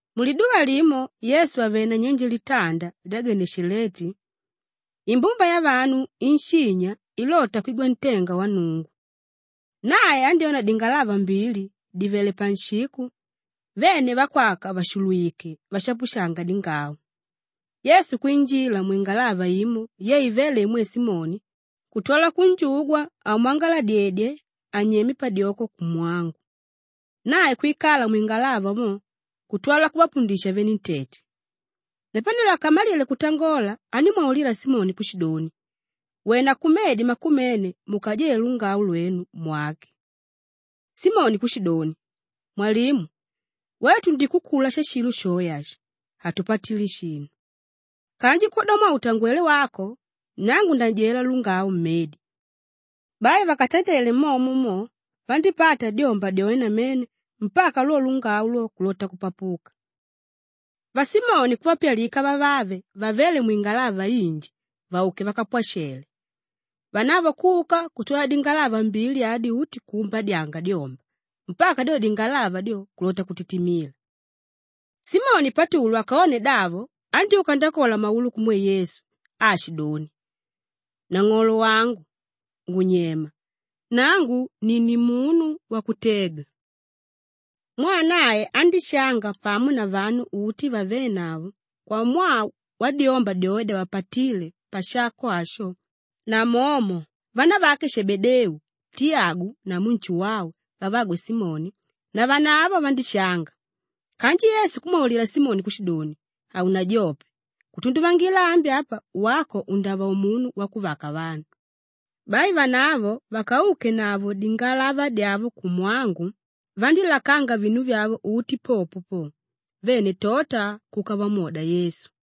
Muliduva limo Yesu àvele nanyenje litanda lya Geneshaleti, imbumba yavanu inshinya ilota kwigwa ntenga wa Nnungu, nae andyóna dingalava mbili dìvele panshiko vene vakwaka vàshulwike vashapushanga dingau. Yesu kwinjila mwingalava imo ye ivéle imwe Simoni kutwala kunjugwa amwangaladyedye anyeme padyoko kumwangu. Nae kwikala mwingalava mo kutwala kuvapundisha venentete. Napanelo akamalile kutangola andímwaulila Simoni kushidoni, “Wena kumedi makumene mukajele lungau lwenu mwake.” Simoni kushidoni, “Mwalimu, wetu tundikukula shashilo shoe ashi, hatupatile shinu. Kanji kwodamwaa utangwelé wako, nangu ndajela lungau mmedi.” Bai vakatandele momo mo, vandípata dyomba dyoe namene mpaka lwo lungau lwo kulota kupapuka. Vasimoni kuvapyalika vavave vavéle mwingalava inji vauke vakavapwashele. Vanavo kuka kutwala dingalava mbili adi uti kuumbadyanga dyomba mpaka dyo dingalava dyo, kulota kutitimila. Simoni Patulu akone davo andyúka ndakola maulu kumwe Yesu aashidoni, “Nang'olo wangu, ngunyema; nangu ni nimunu wakutega.” Mwaa nae andíshanga pamo na vanu uti vavénavo kwamwaa wadyomba dyoe dyavapatíle pashako asho namomo vanavake Shebedeu, Tiyagu namu Nshuwau vavagwe Simoni, navanavo vandíshanga. Kanji Yesu kumwaulila Simoni kushidoni, “Haunajope, kutunduvangila ambi apa wako undava umunu wakuvaka vanu.” Bai vanavo vakaukenavo dingalava dyavo kumwangu, vandílakanga vinu vyavo uti popo po; vene tota kuka vamwoda Yesu.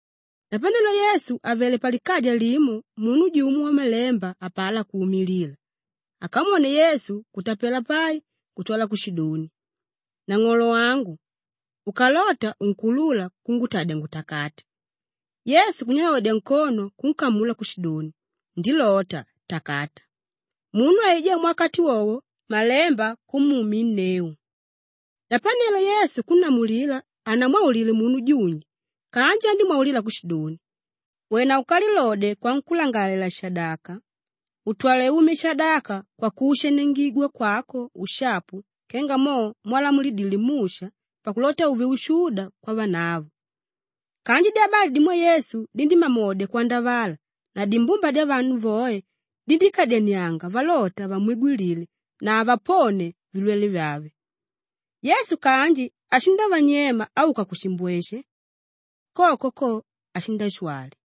Napanelo Yesu àvele palikaja limo munu jumo wamalemba apalá kuumilila! Akamwone Yesu kutapela pai kutwala kushidoni, “Nang'olo wangu, ukalota unkuulula kungutadya ngutakate.” Yesu kunyalodya nkono kunkamula kushidoni, “Ndilota, takata!” Munu aijá muwakati wowo malemba kumuuminneu. Napanelo Yesu kunnamulila hanamwaulile munu junji kanji andímwaulila kushidoni, “Wena ukalilodye kwankúlangalalela-shadaka, utwale umye shadaka kwakuushaniangigwa kwako ushapu kenga mo mwalamulidile Musha pakulota uve ushuda kwavanavo.” Kanji dyabali dimwe Yesu dindímamodya kwandavala na dimbumba dyavanu voe dindíkadyanianga valota vamwigwilile na avaponie vilwele vyave. Yesu kanji ashindavanyema auka kushimbweshe. Koko ko, ashindashwali.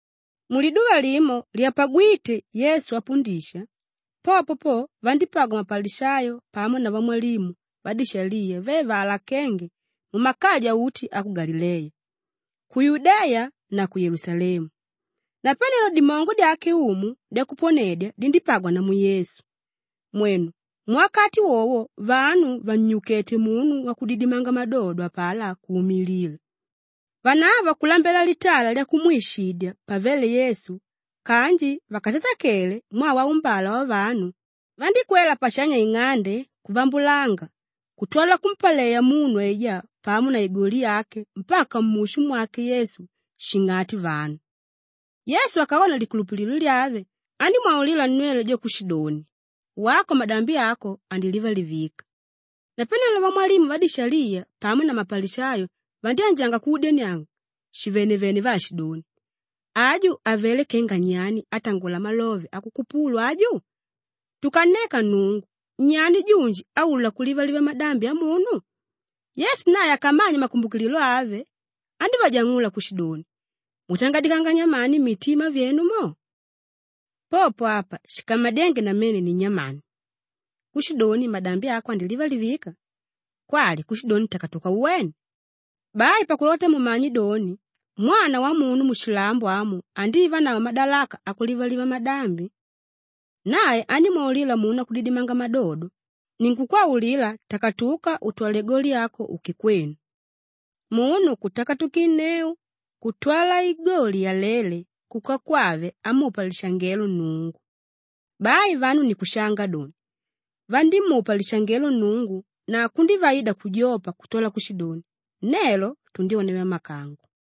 Muliduva limo lyapagwíte Yesu apundisha, popo po vandípagwa mapalishayo pamo na vamwalimu vadishaliya ve vaalakénge mumakaja uti a ku Galileya, ku Yudeya na ku Yelusalemu. Napanelo dimongo dyake Umu dyakuponedya dindípagwa namu Yesu. Mwenu, muwakati wowo vanu vannyukéte munu wakudidimanga madodo apalá kuumilila. Vanavo kulambela litala lyakumwishidya pavele Yesu kanji vakatatakele mwaa waumbala wavanu, vandíkwela pashanya ing'ande kuvambulanga kutwala kumpaleya munu aijá pamo na igoli yake mpaka mushu mwake Yesu shing'ati vanu. Yesu akone likulupililo lyave, andímwaulila nnwele jo kushidoni, “Wako madambi ako andilivalivika.” Napanelo vamwalimu vadishaliya pamo na mapalishayo vandyánjanga kuudyania shivenevene vaashidoni, “Aju avelé kenga nyani, átangola malove akukupulu aju? Tukanneka Nnungu, nyani junji áulula kulivaliva madambi amunu?” Yesu nae akamanye makumbukililo ave, andívajang'ula kushidoni, “Mutangadikanga nyamani mmitima myenu mo? Popo apa shikamadyénge namene ni nyamani? Kushidoni ‘Madambi ako andilivalivika,’ kwali kushidoni ‘Takatuka uwene’? Bai pakulota mumanye doni, Mwana Wamunu mushilambo amu andivanavo madalaka akulivaliva madambi…” Nae andímwaulila munu wakudidimanga madodo, “Ninkukwaulila takatuka utwale igoli yako uke kwenu.” Munu kutakatukinneu kutwala igoli yaléle kuka kwave amupa lishangelo Nnungu. Bai vanu ni kushanga doni, vandímupa lishangelo Nnungu na kundívaida kujopa kutwala kushidoni, “Nelo tundyona vyamakango.”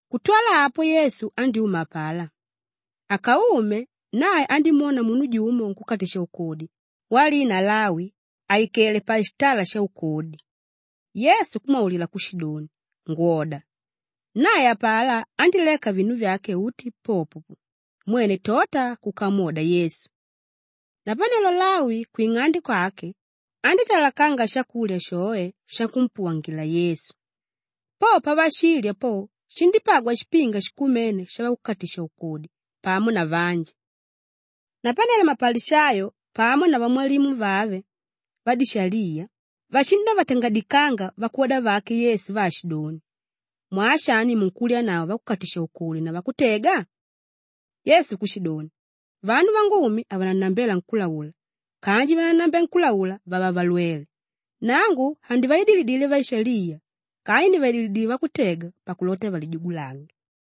Kutwala apo Yesu andyúma apalá; akaume nae andímwona munu jumo nkúkatisha-ukodi walina Lawi àikele pashitala shaukodi, Yesu kumwaulila kushidoni, “Ngwoda!” Nae apalá andíleka vinu vyake uti popo po, mwene tota kuka amwoda Yesu. Napanelo Lawi kwing'ande kwake, andítalakanga shakulya shoe shakumpuwangila Yesu. Po pavashilya po, shindípagwa shipinga shikumene shavakukatisha-ukodi pamo na vanji. Napanelo mapalishayo pamo na vamwalimu vave vadishaliya vashindavatangadikanga vakwoda vake Yesu vaashidoni, “Mwaa shani munkulyanavo vakukatisha-ukodi na vakutega?” Yesu kushidoni, “Vanu vangumi havanannambela nkúlaula kanji vánannambela nkúlaula vava valwele. Nangu handivaidilile vaishaliya kanji ndivaidilile vakutega pakulota valijugulange.”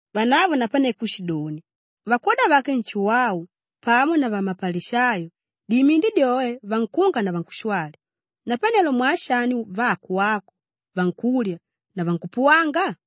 Vanavo napane kushidoni, “Vakwoda vake Nshuwau pamo na vamapalishayo dimindi dyoe vankunga na vankushwali; napanelo mwaa shani vako wako vankulya na vankupuwanga?”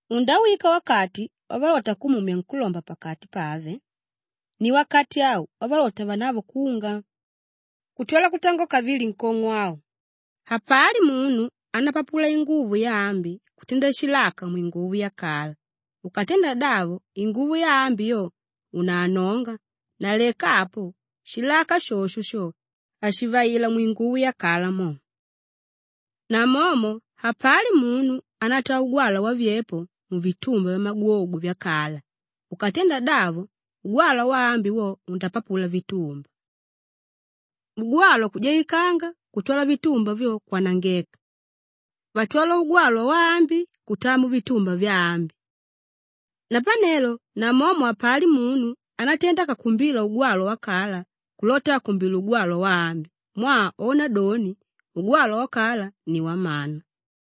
Undawika wakati wavalota kumumya nkúlomba pakati pave; ni wakati au wavalota vanavo kunga.” Kutwala kutangola kavili nkong'o au, “Hapali munu ánapapula inguvo yaambi kutenda shilaka mwinguvo yakala; ukatenda davo inguvo yaambi yo unaanonga na leka apo, shilaka shosho sho hashivaila mwinguvo yakala mo. Namomo hapali munu ánataa ugwalwa wavyepo muvitumba vyamagwogwe vyakala; ukatenda davo ugwalwa waambi wo undapapula vitumba; ugwalwa kujaikanga kutwala vitumba vyo, kwanangeka. Vatwala ugwalwa waambi kutaa muvitumba vyambi. Napanelo namomo hapali munu ánatenda akakumbila ugwalwa wakala kulota akumbile ugwalwa waambi mwaa ona doni, ‘ugwalwa wakala ni wamana.’”